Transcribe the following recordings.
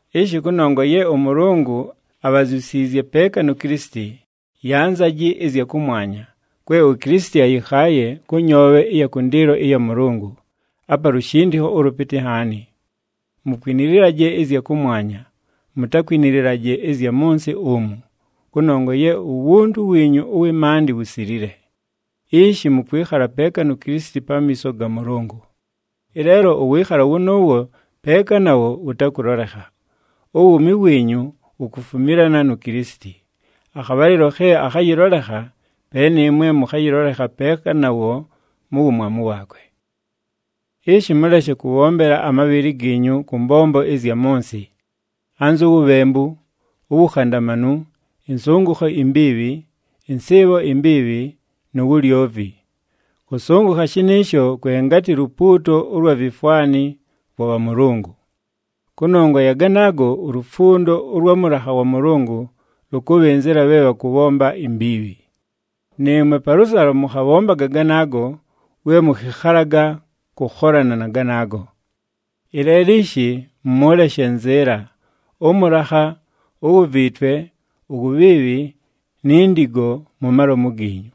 Ishi kʉnongwa ye ʉMʉlʉngʉ abhazyusiizye peeka nu Kilisiti, yanzaji ɨzya kʉmwanya, kwe uKilisiti ayɨkhaaye kʉ nyoobhe ɨya kʉndɨɨlo ɨya Mʉlʉngʉ, apa lushindikho ʉlʉpɨtɨ nhaani. Mukwinililaje ɨzya kʉmwanya, mutakwinililaje ɨzya mʉ nsɨ umu, kʉnongwa ye uwuntu wiinyu ʉwɨ maandɨ wusilile. Ishi mʉkwɨkhala peeka nu Kilisiti pamiiso ga Mʉlʉngʉ. Ɨleelo ʉwɨɨkhalo wʉnʉʉwo peeka nawo wʉtakʉlolekha. Uwuumi wiinyu wukufumilana nu Kilisiti. Akhabhalɨlo khe akhayɨlolekha, pe nɨɨmwe mʉkhayɨlolekha peeka nawo mu wumwamu waakwe. Ishi mʉleshe kʉbhombela amabhɨlɨ giinyu kʉ mbombo ɨzya mʉ nsɨ, anzu wubhembu, uwukhandamanu, ɨnsʉngʉkho imbiibhi, ɨnsɨɨbho imbiibhi, nu wulyovi. Kʉsʉngʉkha shɨnɨɨsho kwe ngatɨ lupuuto ʉlwa vifwani vwa bhamʉlʉngʉ. Kʉnongwa ya ganaago, ulufundo ʉlwa mʉlakha wa Mʉlʉngʉ lʉkʉbhɨnzɨla bhe bhakʉbhomba imbiibhi. Nɨɨmwe palʉsalo mʉkhabhombaga ganaago we mʉkhɨkhalaga kʉkholana na ganaago. Ɨleelo ishi mʉleshe nzɨɨla, ʉmʉlakha, uwuviitwe, uwubhiibhi, ni ndigo mu malomu giinyu.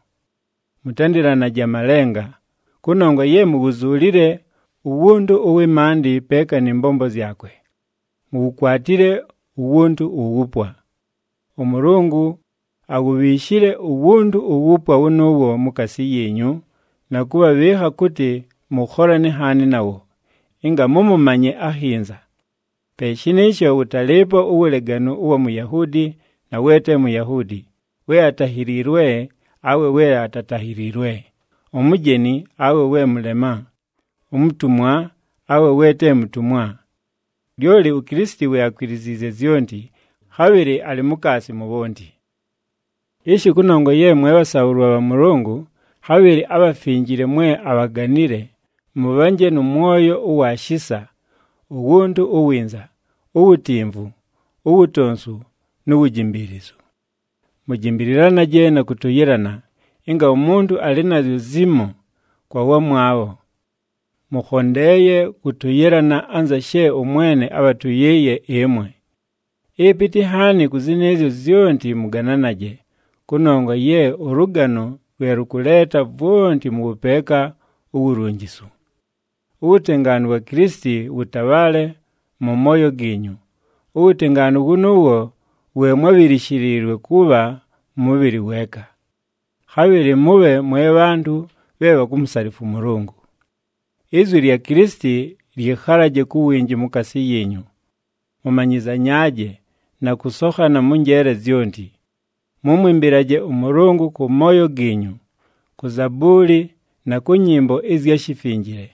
Mʉtandɨlanaje amalenga, kʉnongwa ye muwuzuulile uwuntu ʉwɨ maandɨ peeka nɨ mbombo zyakwe, muwukwatile uwuntu uwupwa. ɄMʉlʉngʉ awubhiishile uwuntu uwupwa wʉnʉʉwo mukaasi yiinyu, na kʉbhabhɨɨkha kʉtɨ mʉkholane nhaani nawo, ɨnga mʉmʉmanye akhinza. Pe shɨnɨɨsho wʉtalɨɨpo uwuleganu ʉwa Muyahuudi na we te Muyahuudi, we atahiliilwe awe we atatahiliilwe, umujeni awe we mʉlema, umutumwa awe we te mutumwa. Lyoli uKilisiti we akwiliziizye zyonti, khabhɨlɨ alɨ mukaasi mu bhonti. Ishi kʉnongwa ye mwe bhasaabhʉlwa bha Mʉlʉngʉ, khabhɨlɨ abhafinjile mwe abhaganile, mʉbhanje nʉ mwoyo ʉwa shisa, uwuntu uwinza, uwutimvu, uwutonsu, nu wujimbiilizu. Mujimbililanaje na kʉtʉyɨlana, ɨnga umuntu alɨ nazyo zimo kwa wamwabho. Mʉkhondeeye kʉtʉyɨlana anza she ʉMwene abhatʉyɨɨye ɨmwe. Ɨpɨtɨ nhaani kʉ zɨnɨɨzyo zyonti mʉgananaje, kʉnongwa ye ʉlʉgano lwe lʉkʉleeta vwonti mʉ wʉpeeka uwulunjisu. Uwutengaanu wa Kilisiti wʉtabhaale mʉ mooyo giinyu, uwutengaanu wʉnʉʉwo we mwábhishiliilwe kʉbha mʉbhɨlɨ weeka. Khabhɨlɨ mʉbhe mwe bhantʉ bhe bhakumusalifwa ʉMʉlʉngʉ. Izwi lya Kilisiti lyɨkhalaje ku winji mukaasi yiinyu. Mʉmanyɨzanyaaje, na kʉsokhana mʉ njeele zyonti. Mʉmwɨmbɨlaje ʉMʉlʉngʉ kʉ mooyo giinyu, ku zabuuli na kʉ nyɨmbo ɨzya shifinjile,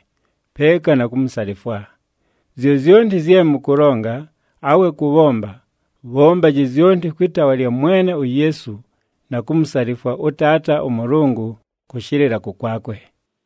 peeka na kumusalifwa. Zyozyonti zye mʉkʉlonga, awe kʉbhomba, bhombaji zyonti kwɨ taawa lya Mwene uYeesu, na kumusalifwa ʉTaata ʉMʉlʉngʉ kʉshɨlɨla kʉkwakwe.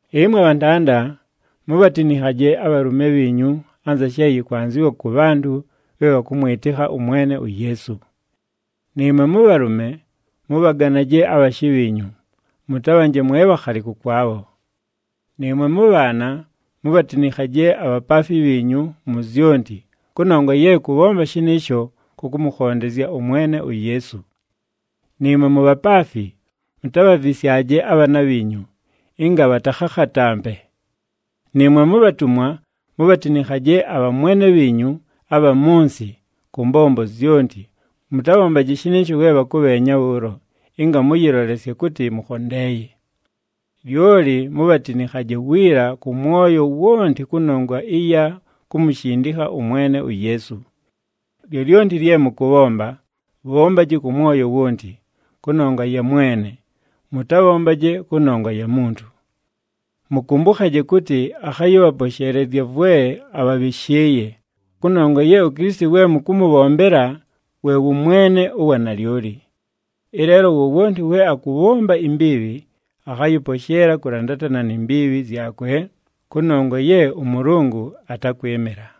Ɨmwe bhantanda, mubhatinikhaje abhalʉme bhiinyu anza she yɨkwanzɨwa kʉ bhantʉ bhe bhakʉmwɨtɨkha ʉMwene uYeesu. Nɨɨmwe mʉbhalʉme, mʉbhaganaje abhashɨ bhiinyu, mʉtabhanje mwe bhakhali kʉkwabho. Nɨɨmwe mʉbhaana, mubhatinikhaje abhapaafi bhiinyu mu zyonti, kʉnongwa ye kʉbhomba shɨnɨɨsho kʉkʉmʉkhondezya ʉMwene uYeesu. Nɨɨmwe mubhapaafi, mutabhavisyaje abhaana bhiinyu, ɨnga bhatakhakhatampe. Nɨɨmwe mubhatumwa, mubhatinikhaje abhamwene bhiinyu abha mʉ nsɨ kʉ mbombo zyonti, mʉtabhombaje shɨnɨɨsho we bhakʉbheenya bhʉʉlo ɨnga mʉyɨlolesye kʉtɨ mʉkhondeeye. Lyoli mubhatinikhaje wiila kʉ mwoyo wonti kʉnongwa ɨya kumushindikha ʉMwene uYeesu. Lyolyonti lye mʉkʉbhomba, bhombaji kʉ mwoyo wonti, kʉnongwa ya Mwene, mʉtabhombaje kʉnongwa ya muntu. Mʉkʉmbʉkhaje kʉtɨ akhayɨbhaposheelezya vwe abhabhɨshɨɨye, kʉnongwa ye uKilisiti we mʉkʉmʉbhombela we wʉ Mwene ʉwa nalyoli. Ɨleelo wowonti we akʉbhomba imbiibhi akhayɨposheela kʉlandatana ni mbiibhi zyakwe, kʉnongwa ye ʉMʉlʉngʉ atakwɨmɨla.